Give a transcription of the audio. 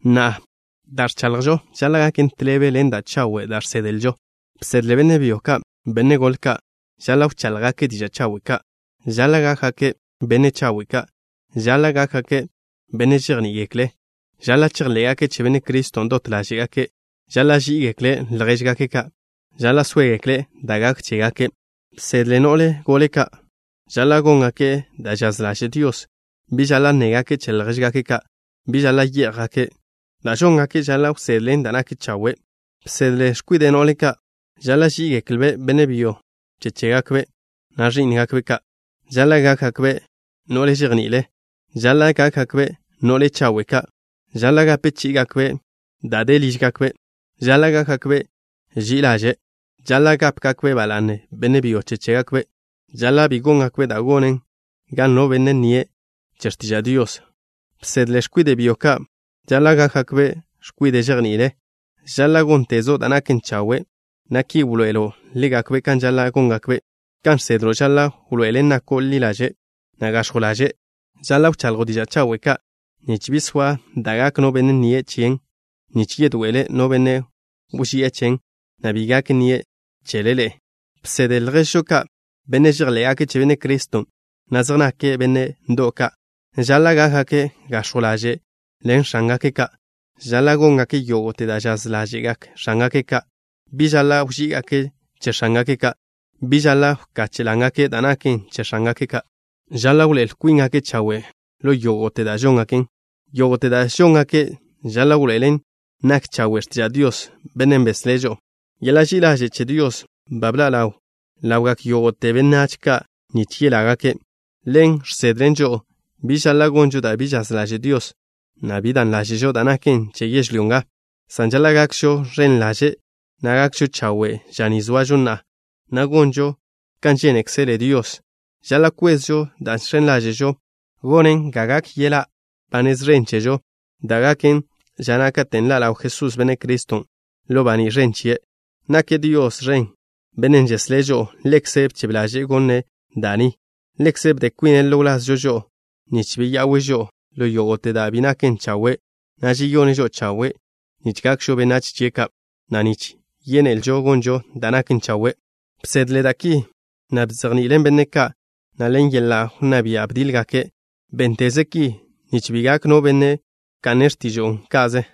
Na'a, da' ẕchaḻjo' žaḻa' gaken tḻebe ḻen da' chawe' da' žsedlžo. Bsedle benne' byo, benne' gole ka': Žaḻa' wcháḻjgake' diža' chawe' ka'. Žaḻa' gákgake' benne' chawe' ka'. Žaḻa' gákgake' benne' žejní'igekle'. Žaḻa' chejḻé'gake' che Benne' Criston' dot ḻáže'gake'. Žaḻa' ží'igekle' ljéžgake' ka'. Žaḻa' sóegekle' da' gak chégake'. Bsedle no'le gole ka': Žaḻa' góngake' da' žaz ḻaže' Dios. Bi žaḻa' nnégake' che ljéžgake' ka'. Bi žaḻa' yé'jgake'. Da' žóngake' žaḻa' wsedlen da' nak chawe'. Bsedle x̱kwide' no'le ka'. Žaḻa' ží'igeklbe' benne' byo che chégakbe', na' ẕí'ngakbe' ka'. Žaḻa' gákgakbe' no'le žejni'ile. Žaḻa' gákgakbe' no'le chawe' ka'. Žaḻa' gape chí'igakbe' da' de lížgakbe'. Žaḻa' gákgakbe' ži'i ḻaže'. Žaḻa' gápegakbe' ba la'ne benne' byo che chégakbe'. Žaḻa' bi góngakbe' da' gonen ga no benne' nnie' che x̱tiža' Dios. Bsedle x̱kwide' byo ka': Žaḻa' gákgakbe' x̱kwide' žejni'ile. Žaḻa' góntezo' da' naken chawe', na' ki wḻoe'elo' ḻégakbe' kan žaḻa' góngakbe'. Kan žsedlo' žaḻa' wḻoe'elen nako' ḻi ḻaže', na' gax̱jw ḻaže'. Žaḻa' wchaḻjo' diža' chawe' ka' nich bi soa da' gak no benne' nnie' chen, nich yedoe'ele no benne' wži'e chen, na' bi gak nnie' chele ḻe'e. Bsedle lježžo ka', benne' žejḻé'gake' che Benne' Criston', na' zej nake' benne' ndo'w ka': Žaḻa' gákgake' gax̱jw ḻaže' ḻen x̱ángake' ka'. Žaḻa' góngake' yógo'te da' žaz ḻáže'gak x̱ángake' ka'. Bi žaḻa' wží'igake' che x̱ángake' ka'. Bi žaḻa' wkache' lángake' da' naken che x̱ángake' ka'. Žaḻa' wḻoé'el kwíngake' chawe' ḻo yógo'te da' žóngake'. Yógo'te da' žóngake' žaḻa' wḻoe'elen nak chawe' x̱tiža' Dios, Bennen' beslé' žo'o. Yeḻa' ži'i ḻaže' che Dios ba bḻa' ḻawn ḻawgak yógo'te benách ka' nich yelágake'. Ḻen žsedlen žo'o biž žaḻa' gonžo da' bi žaz ḻaže' Dios, na' bi dan ḻáže'žo da' naken che yežlyó nga, san žaḻa' gakžo ẕen ḻaže', na' gakžo chawe' ža ni zoažo na'a, na' gonžo kan žénekzele Dios. Žaḻa' kwezžo da' žx̱en ḻáže'žo gonen ga gak yeḻa' ba nez ẕen chežo, dan' gaken ža na' katen' ḻa' ḻaw Jesús, Benne' Criston', ḻo baní' ẕen chie'. Nake' Dios ẕen, na' Bennen' žeslé' žo'o. Ḻekze' bchebe ḻaže'e gone' da' ni. Ḻekze' bde kwine' ḻo wlazžo žo'o, nich beya'we' žo'o ḻo yógo'te da' bi naken chawe', na' žeyone' žo'o chawe' nich gakžo benách chie' ka', na' nich yénelžo gonžo da' naken chawe'. Bsedle da' ki, na' bzejni'ilen benne' ka', na' ḻen yeḻa' wnná bia' bdiḻ-gake'. Bénteze ki, nich bi gak no benne' wka'ne' x̱tižo'o ka'ze.